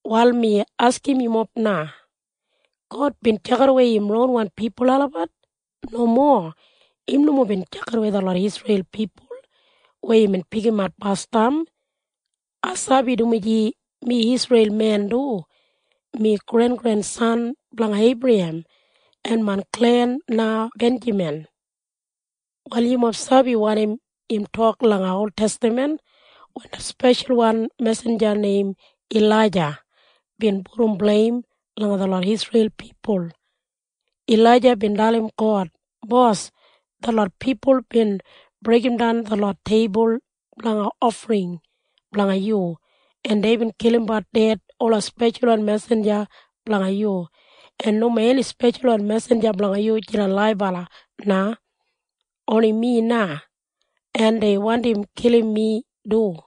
Wal mi askim yumob na. God bin tjakidawei im ronwan pipul olabat? Nomo. Im nomo bin tjakidawei detlot Isreil pipul weya imbin pikimat basdam. Ai sabi, dumaji mi Isreil men du. Mi grengrensan blanga Eibrahem, en main klen na Benjamin. Wal yumob sabi wanim im tok langa oltestaman wen det speshalwan mesinja neim Ilaija bin pudum bleim langa detlot Isreil pipul. Ilaija bin dalim God, “Bos, detlot pipul bin breigimdan detlot teibul blanga ofring blanga yu, en deibin kilimbat ded ola speshalwan mesinja blanga yu, en nomo eni speshalwan mesinja blanga yu jidan laibala na. Oni mi na. En dei wandim kilim mi du.”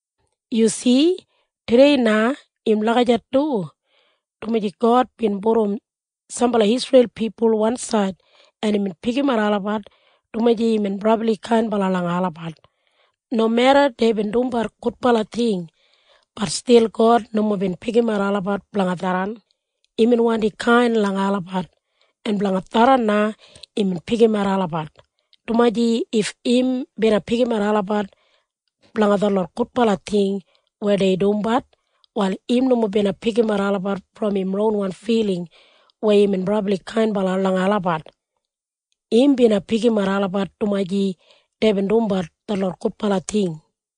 Yu si? Tudei na im lagijat du, dumaji God bin pudum sambala Isreil pipul wansaid, en imbin pikimat olabat dumaji imbin brabli kainbala langa olabat. Nomeda deibin dumbat gudbala ting, bat stil God nomo bin pikimat olabat blanga tharran. Imbin wandi kain langa olabat, en blanga tharran na imbin pikimat olabat, dumaji if im bina pikimat olabat blanga detlot gudbala ting weya dei dumbat, wal im nomo bina pikimat olabat brom im ronwan filing weya imbin brabli kainbala langa olabat. Im bina pikimat olabat dumaji deibin dumbat detlot gudbala ting.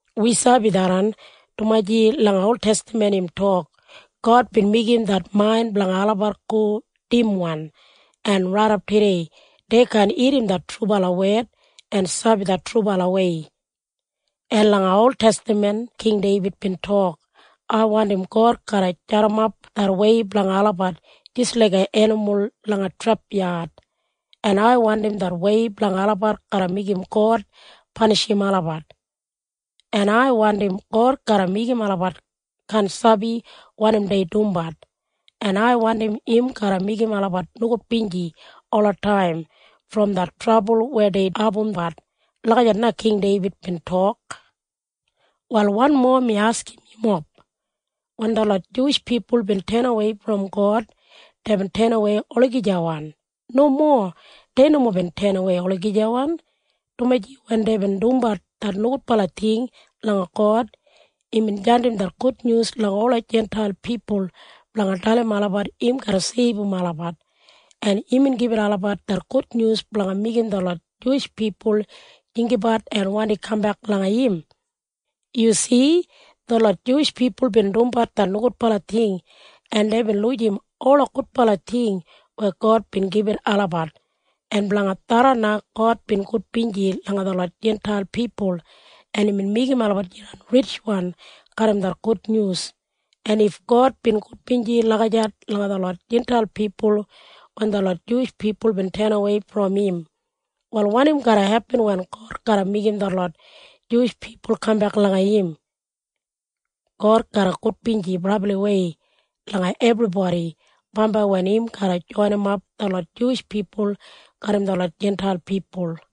Wi sabi tharran, dumaji langa oltestaman im tok, “God bin meigim det main blanga olabat go dimwan, en raidap tudei dei kaan irrim det trubala wed en sabi det trubalawei.” En langa oltestaman King Deibid bin tok, “Ai wandim God garra jadimap det wei blanga olabat jis laiga enimul langa trepyad. En ai wandim det wei blanga olabat garra meigim God panishim olabat. En ai wandim God garra meigim olabat kaan sabi wanim dei dumbat, en ai wandim im garra meigim olabat nogudbinji olataim brom det trabul weya dei abumbat.” Lagijat na King Deibid bin tok. Wal wanmo mi askim yumob. Wen detlot Juwish pipul bin tenawei brom God, deibin tenawei olagijawan? Nomo. Dei nomo bin tenawei olagijawan, dumaji wen deibin dumbat det nogudbala ting langa God, imbin jandim det gudnyus langa ola Jintail pipul blanga dalim olabat im garra seibum olabat, en imbin gibit olabat det gudnyus blanga meigim detlot Juwish pipul jinggabat en wandi kambek langa im. Yu si? Detlot Juwish pipul bin dumbat det nogudbala ting, en deibin lujim ola gudbala ting weya God bin gibit olabat. En blanga tharran na God bin gudbinji langa detlot Jintail pipul, en imbin meigim olabat jidan ritjwan garram det gudnyus. En if God bin gudbinji lagijat langa detlot Jintail pipul wen detlot Juwish pipul bin tenawei brom im, wal wanim garra hepin wen God garra meigim detlot Juwish pipul kambek langa im? God garra gudbinji brabliwei langa ebribodi bambai wen im garra joinimap detlot Juwish pipul garram detlot Jintail pipul.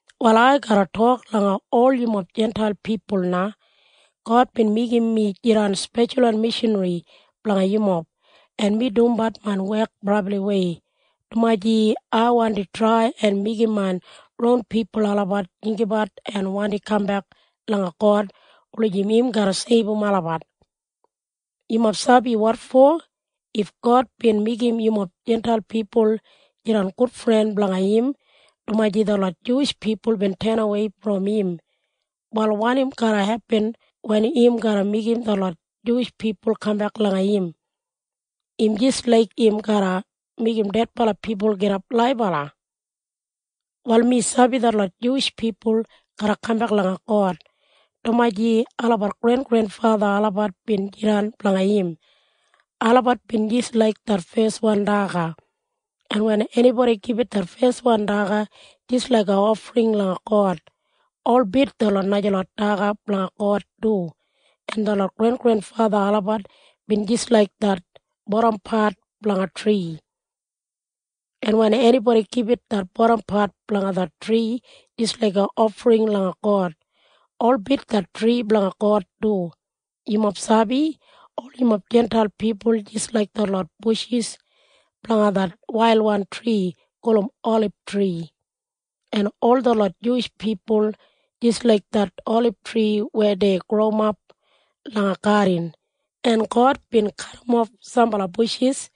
Wal ai garra tok langa ol yumob Jintail pipul na. God bin meigim mi jidan speshalwan mishanri blanga yumob, en mi dumbat main wek brabliwei, dumaji ai wandi trai en meigim main ron pipul olabat jinggabat en wandi kambek langa God wulijim im garra seibum olabat. Yumob sabi wotfo? If God bin meigim yumob Jintail pipul jidan gudfren blanga im dumaji detlot Juwish pipul bin tenawei brom im, wal wanim garra hepin wen im garra meigim detlot Juwish pipul kambek langa im? Im jis laik im garra meigim dedbala pipul gidap laibala. Wal mi sabi detlot Juwish pipul garra kambek langa God, dumaji olabat grengrenfatha olabat bin jidan blanga im. Olabat bin jis laik det feswan daga. En wen enibodi gibit det feswan daga jis laiga ofring langa God, holbit detlot najalot daga blanga God du. En detlot grengrenfatha olabat bin jis laik det bodampat blanga tri. En wen enibodi gibit det bodampat blanga det tri jis laiga ofring langa God, holbit det tri blanga God du. Yumob sabi? Ol yumob Jintail pipul jis laik detlot bushis blanga det wailwan tri gulum olibtri, en ol detlot Juwish pipul jis laik det olibtri weya dei growimap langa gadin. En God bin kadimof sambala bushis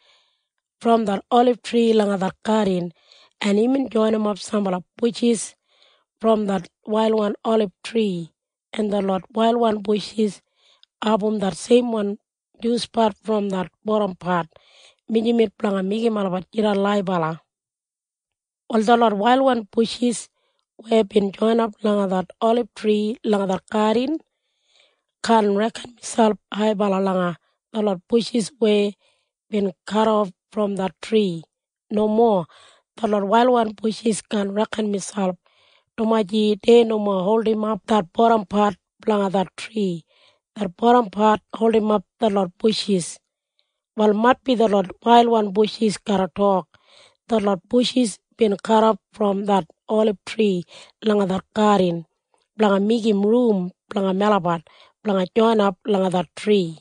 brom det olibtri langa det gadin, en imbin joinimap sambala bushis brom det wailwan olibtri, en detlot wailwan bushis abum det seimwan juspat brom det bodampat mijamet blanga meigim olabat jidan laibala. Wal detlot wailwan bushis weya bin joinap langa det olibtri langa det gadin kaan reken miselp haibala langa detlot bushis weya bin kadof brom det tri. Nomo. Detlot wailwan bushis kaan reken miselp, dumaji dei nomo holdimap det bodampat blanga det tri. Det bodampat holdimap detlot bushis. Wal maitbi detlot wailwan bushis garra tok, “Detlot bushis bin kadof brom det olibtri langa det gadin blanga meigim rum blanga melabat blanga joinap langa det tri.”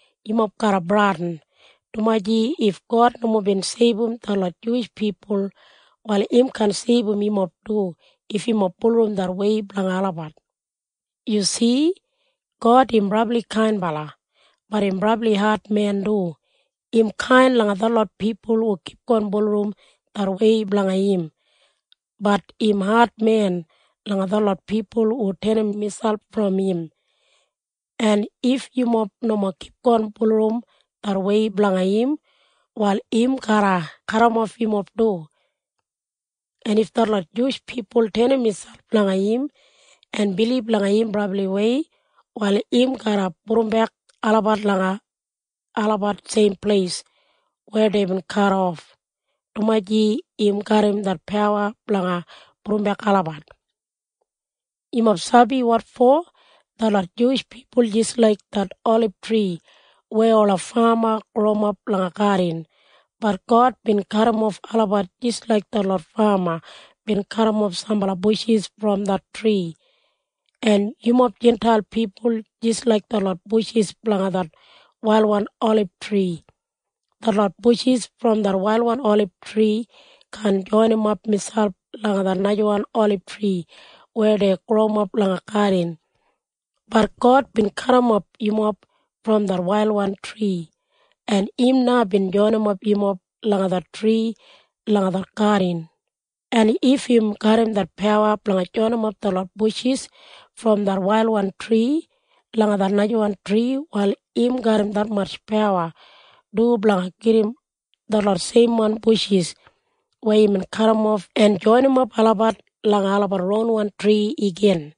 Yumob garra bradin, dumaji if God nomo bin seibum detlot Juwish pipul, wal im kaan seibum yumob du if yumob bulurrum det wei blanga olabat. Yu si? God im brabli kainbala. Bat im brabli admen du. Im kain langa detlot pipul hu kipgon bulurrum det wei blanga im. Bat im admen langa detlot pipul hu tenim miselp brom im. En if yumob nomo kipgon bulurrum det wei blanga im, wal im garra kadimof yumob du. En if detlot Juwish pipul tenim miselp langa im en bilib langa im brabliwei, wal im garra pudumbek olabat langa olabat seim pleis weya deibin kadof, dumaji im garram det pawa blanga pudumbek olabat. Yumob sabi wotfo? Detlot Juwish pipul jis laik det olibtri weya ola fama growimap langa gadin. Bat God bin kadimof olabat jis laik detlot fama bin kadimof sambala bushis brom det tri. En yumob Jintail pipul jis laik detlot bushis blanga det wailwan olibtri. Detlot bushis brom det wailwan olibtri kaan joinimap miselp langa det najawan olibtri weya dei growimap langa gadin. Bat God bin kadimof yumob brom det wailwan tri, en im na bin joinimap yumob langa det tri langa det gadin. En if im garram det pawa blanga joinimap detlot bushis brom det wailwan tri langa det najawan tri, wal im garram detmatj pawa du blanga gedim detlot seimwan bushis weya imbin kadimof en joinimap olabat langa olabat ronwan tri igin.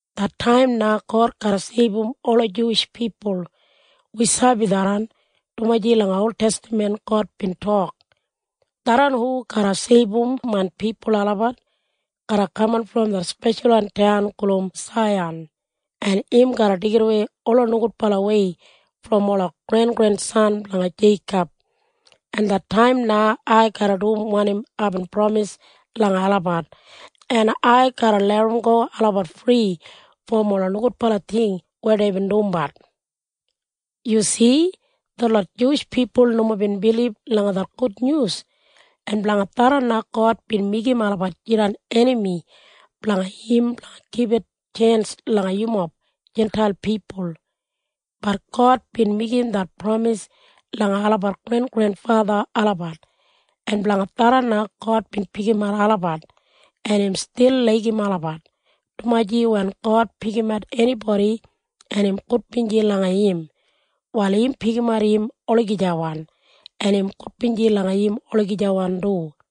Det taim na God garra seibum ola Juwish pipul. Wi sabi tharran, dumaji langa oltestaman God bin tok, “Tharran hu garra seibum main pipul olabat garra kaman brom det speshalwan taun gulum Saiyan, en im garra deigidawei ola nogudbalawei brom ola grengrensan blanga Jeikob, en det taim na ai garra dum wanim aibin pramis langa olabat, en ai garra larramgo olabat fri brom ola nogudbala ting weya deibin dumbat.” Yu si? Detlot Juwish pipul nomo bin bilib langa det gudnyus, en blanga tharran na God bin meigim olabat jidan enami blanga im blanga gibit tjens langa yumob Jintail pipul. Bat God bin meigim det pramis langa olabat grengrenfatha olabat, en blanga tharran na God bin pikimat olabat, en im stil laigim olabat, dumaji wen God pikimat enibodi en im gudbinji langa im, wal im pikimat im olagijawan, en im gudbinji langa im olagijawan du.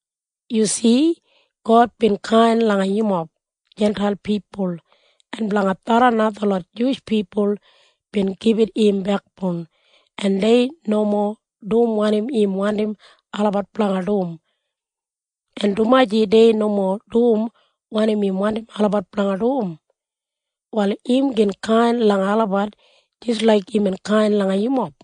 Yu si? God bin kain langa yumob Jintail pipul, en blanga tharran na detlot Juwish pipul bin gibit im bekboun, en dei nomo dum wanim im wandim olabat blanga dum. En dumaji dei nomo dum wanim im wandim olabat blanga dum, wal im gin kain langa olabat jis laik imbin kain langa yumob.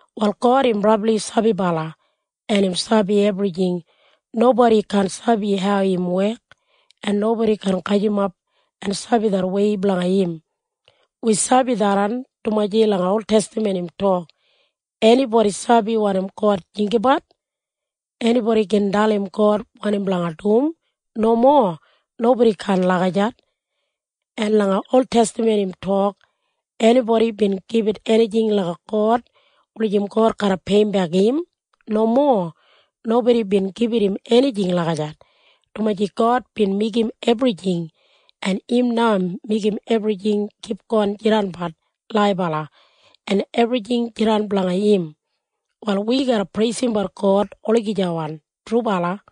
Wal God im brabli sabibala, en im sabi ebrijing. Nobodi kaan sabi hau im wek, en nobodi kaan gajimap en sabi det wei blanga im. Wi sabi tharran, dumaji langa oltestaman im tok, “Enibodi sabi wanim God jinggabat? Enibodi gin dalim God wanim blanga dum?” Nomo. Nobodi kaan lagijat. En langa oltestaman im tok, “Enibodi bin gibit enijing langa God wulijim God garra peiyimbek im?” Nomo. Nobodi bin gibit im enijing lagijat, dumaji God bin meigim ebrijing, en im na meigim ebrijing kipgon jidanbat laibala, en ebrijing jidan blanga im. Wal wi garra preisimbat God olagijawan. Trubala.